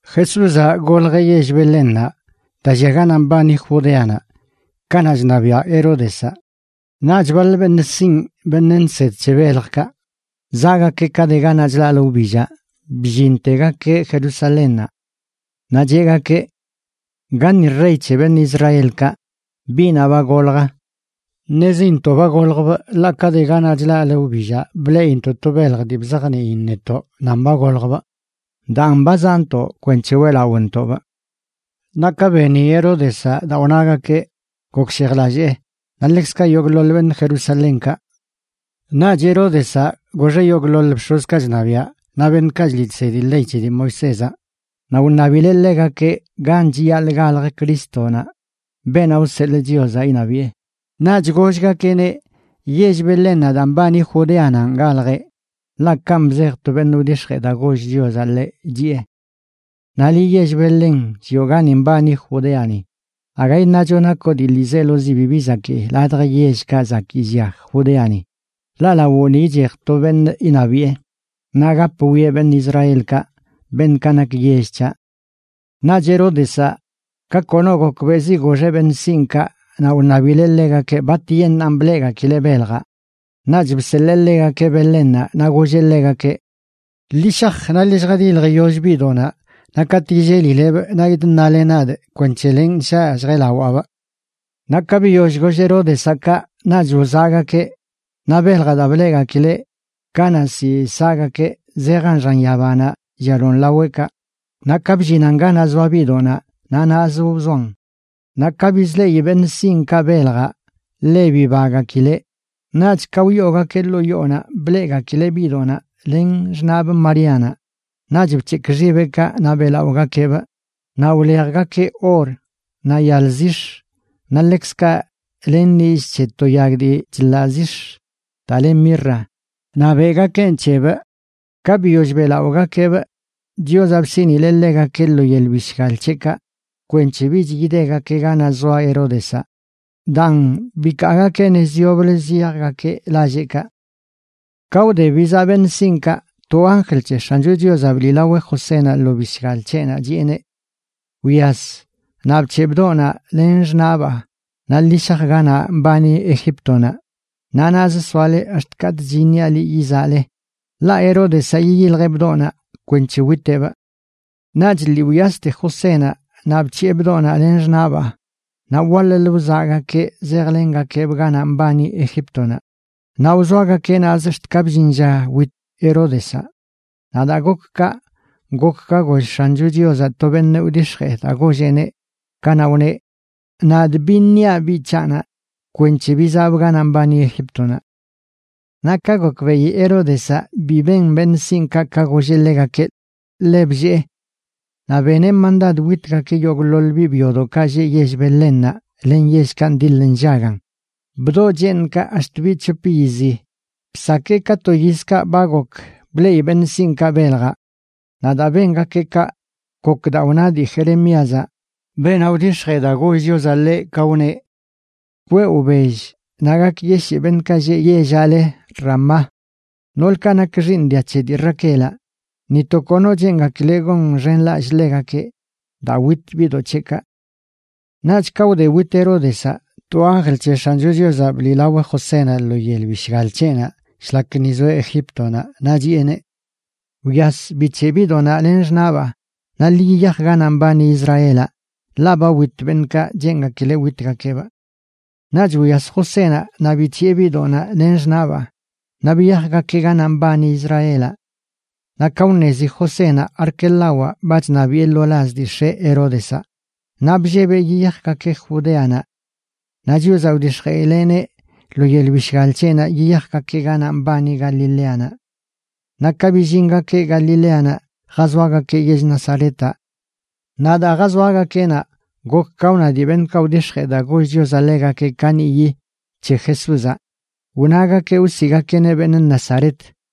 Jesúzaꞌ goljeꞌ yell Belénnaꞌ, daa llia ganaꞌ mbani Judeanaꞌ, kanaꞌ chṉabiaꞌ Heródezaꞌ. Naꞌch baḻ beṉꞌ sinꞌ, beṉꞌ nsed c̱he beljkaꞌ, zaꞌgakeꞌ ka de ganaꞌ chlaꞌlə wbillaꞌ, bllintegakeꞌ Jerusalénnaꞌ. Naꞌ cheꞌgakeꞌ: ―¿Gaṉi rey c̱he beṉꞌ Israelkaꞌ, biꞌnaꞌ ba golj? Ṉezintoꞌ ba goljbꞌ ḻaꞌ ka de ganaꞌ chlaꞌlə wbillaꞌ bleꞌintoꞌ to belj dii bzajniin netoꞌ nan ba goljbꞌ, daan ba zaꞌntoꞌ kwenc̱he weꞌlaꞌontoꞌbꞌ. Naꞌ ka beni Heródezaꞌ daa wnagakeꞌ, gokshejlallee, naꞌ ḻekzkaꞌ yogꞌḻoḻ beṉꞌ Jerusalénkaꞌ. Naꞌch Heródezaꞌ goxeꞌ yogꞌḻoḻ bx̱ozkaꞌ chṉabiaꞌ, naꞌ beṉꞌkaꞌ chliꞌ chsedi ley c̱he dii Moisézaꞌ, naꞌ wṉabileꞌ ḻegakeꞌ gan chiyaḻꞌ galj Crístonaꞌ, beenaꞌ wseḻꞌ Chiozaꞌ iṉabiꞌe. Naꞌch gollgakeꞌneꞌ: ―Yell Belénnaꞌ daa mbani Judeananꞌ galjeꞌ, ḻaꞌ kanꞌ bzej to beṉꞌ wdix̱jee daa goll Chiozaꞌ ḻeꞌ, chiꞌe: Naꞌ liꞌ, yell Belén llioꞌ gani mbani Judeani, aga iṉacho nakoꞌ dii ḻiizelozi bibi zakii ladj yellkaꞌ zakii llia Judeani; ḻaꞌ lawoꞌni ichej to beṉꞌ iṉabiꞌe, naꞌ gap wwieꞌ beṉꞌ Israelkaꞌ, beṉꞌkaꞌ nak yell c̱haꞌ. Naꞌch Heródezaꞌ, ka kono gokbeꞌzi goxeꞌ beṉꞌ sinꞌkaꞌ naꞌ wṉabileꞌ ḻegakeꞌ batyeṉꞌan bleꞌgakileꞌ beljaꞌ. Naꞌch bseḻee ḻegakeꞌ Belénnaꞌ naꞌ golleꞌ ḻegakeꞌ: ―Ḻi shaj, naꞌ ḻi lljadiljyoll biꞌdoꞌnaꞌ, naꞌ katꞌ yillelilebꞌ naꞌ yidṉale nadꞌ kwenc̱he lenꞌ shaꞌ lljeꞌlawaabꞌ. Naꞌ ka biyoll goll Heródezaꞌ kaꞌ, naꞌch wzaꞌgakeꞌ. Naꞌ beljaꞌ daa bleꞌgakileꞌ kanaꞌ ziꞌ saꞌgakeꞌ, zejan xan yabanaꞌ llialon laweꞌkaꞌ, naꞌ ka bllinan ganaꞌ zoa biꞌdoꞌnaꞌ, naꞌ naꞌzə wzoan. Naꞌ ka bizleꞌi beṉꞌ sinꞌkaꞌ beljaꞌ, ḻe bibagakileꞌ. Naꞌch ka wyoogakeꞌ ḻoo yoonaꞌ bleꞌgakileꞌ biꞌdoꞌnaꞌ len xṉaꞌbꞌ Maríanaꞌ. Naꞌch bc̱hekꞌ xibeꞌkaꞌ naꞌ beꞌlaꞌogakeꞌbꞌ. Naꞌ wlejgakeꞌ or, naꞌ yal zix̱, naꞌ ḻekzkaꞌ len nillꞌ c̱he to yag dii chḻaꞌ zix̱ daa le mirra, naꞌ beꞌgakeꞌn c̱hebꞌ. Ka biyoll beꞌlaꞌogakeꞌbꞌ, Chiozaꞌ bsiꞌnileꞌ ḻegakeꞌ lo yel bishgal c̱heꞌkaꞌ kwenc̱he bich yidegakeꞌ ganaꞌ zoa Heródezaꞌ. Daan, bikaagakeꞌ nez yoblə ziyajgakeꞌ lalleꞌkaꞌ. Ka wde bizaꞌ beṉꞌ sinꞌkaꞌ, to anjl c̱he X̱ancho Chiozaꞌ bliꞌlaweꞌ Josénaꞌ lo bishgal c̱heꞌnaꞌ chiꞌeneꞌ: ―Wyas, naꞌ bc̱heꞌ bdoꞌnaꞌ len xṉaꞌbaa naꞌ ḻi shaj ganaꞌ mbani Egíptonaꞌ. Naꞌ naꞌz soale ax̱t katꞌch iṉiaꞌ liꞌ yizaꞌle. Ḻaꞌ Heródezaꞌ yiyiljeꞌ bdoꞌnaꞌ kwenc̱he witeꞌbꞌ. Naꞌch lii wyaste Josénaꞌ naꞌ bc̱hiꞌe bdoꞌnaꞌ len xṉaꞌbaa, naꞌ waḻ-lə wzaꞌgakeꞌ zejlengakeꞌbꞌ ganaꞌ mbani Egíptonaꞌ. Naꞌ wzoagakeꞌ naꞌzə ax̱t ka bllin lla wit Heródezaꞌ. Naꞌ daa gok kaꞌ, gok ka goll X̱ancho Chiozaꞌ to beṉꞌ wdix̱jee daa golleꞌneꞌ, kanaꞌ wneꞌ: “Nadꞌ biṉiaꞌ biꞌ c̱haꞌnaꞌ kwenc̱he bizaꞌbꞌ ganaꞌ mbani Egíptonaꞌ.” Naꞌ ka gokbeꞌi Heródezaꞌ bi ben beṉꞌ sinꞌkaꞌ ka golleꞌ ḻegakeꞌ, ḻe bllee. Naꞌ beneꞌ mandad witgakeꞌ yogꞌḻoḻ biꞌ byodoꞌkaꞌ lleꞌ yell Belénnaꞌ len yellkaꞌ ndiḻ nllagan, bdoꞌ cheeṉkaꞌ ax̱t biꞌ c̱hop yizi, bsakee ka to yizkaꞌ ba gok bleꞌi beṉꞌ sinꞌkaꞌ beljaꞌ. Naꞌ daa bengakeꞌ kaꞌ, gok daa wna dii Jeremíazaꞌ, beenaꞌ wdix̱jee daa goll Chiozaꞌ ḻeꞌ, ka wneꞌ: Kweꞌ wbell naꞌ gakyeshii beṉꞌkaꞌ lleꞌ yellaꞌ le Ramá. Noolkaꞌ nak xiiṉ dia c̱he dii Raquelaꞌ ni to kono cheengakileꞌ gonxenlallꞌ ḻegakeꞌ, daa wit biꞌdoꞌ c̱heꞌkaꞌ. Naꞌch ka wde wit Heródezaꞌ, to anjl c̱he X̱ancho Chiozaꞌ bliꞌlaweꞌ Josénaꞌ lo yel bishgal c̱heꞌnaꞌ shlak ni zoeꞌ Egíptonaꞌ, naꞌ chiꞌeneꞌ: ―Wyas, bic̱heꞌ biꞌdoꞌnaꞌ len xṉaꞌbaa naꞌ ḻi yiyaj ganaꞌ mbani Israelaꞌ, ḻaꞌ ba wit beṉꞌkaꞌ cheengakileꞌ witgakeꞌbꞌ. Naꞌch wyas Josénaꞌ naꞌ bic̱hiꞌe biꞌdoꞌnaꞌ len xṉaꞌbaa naꞌ biyajgakeꞌ ganaꞌ mbani Israelaꞌ. Naꞌ ka wṉezi Josénaꞌ Arquelawaꞌ ba chṉabiꞌe lo laz dii x̱eꞌ Heródezaꞌ, naꞌ bllebeꞌ yiyajgakeꞌ Judéanaꞌ. Naꞌ Chiozaꞌ wdix̱jeꞌileꞌneꞌ lo yel bishgal c̱heꞌnaꞌ yiyajgakeꞌ ganaꞌ mbani Galileanaꞌ. Naꞌ ka billingakeꞌ Galileanaꞌ jazoagakeꞌ yell Nazaretaꞌ. Naꞌ daa jazoagakeꞌ naꞌ, gok ka wna dii beṉꞌkaꞌ wdix̱jee daa goll Chiozaꞌ ḻegakeꞌ kaniꞌyi c̱he Jesúzaꞌ, wnagakeꞌ wsiꞌgakeꞌneꞌ beṉꞌ Nazaret.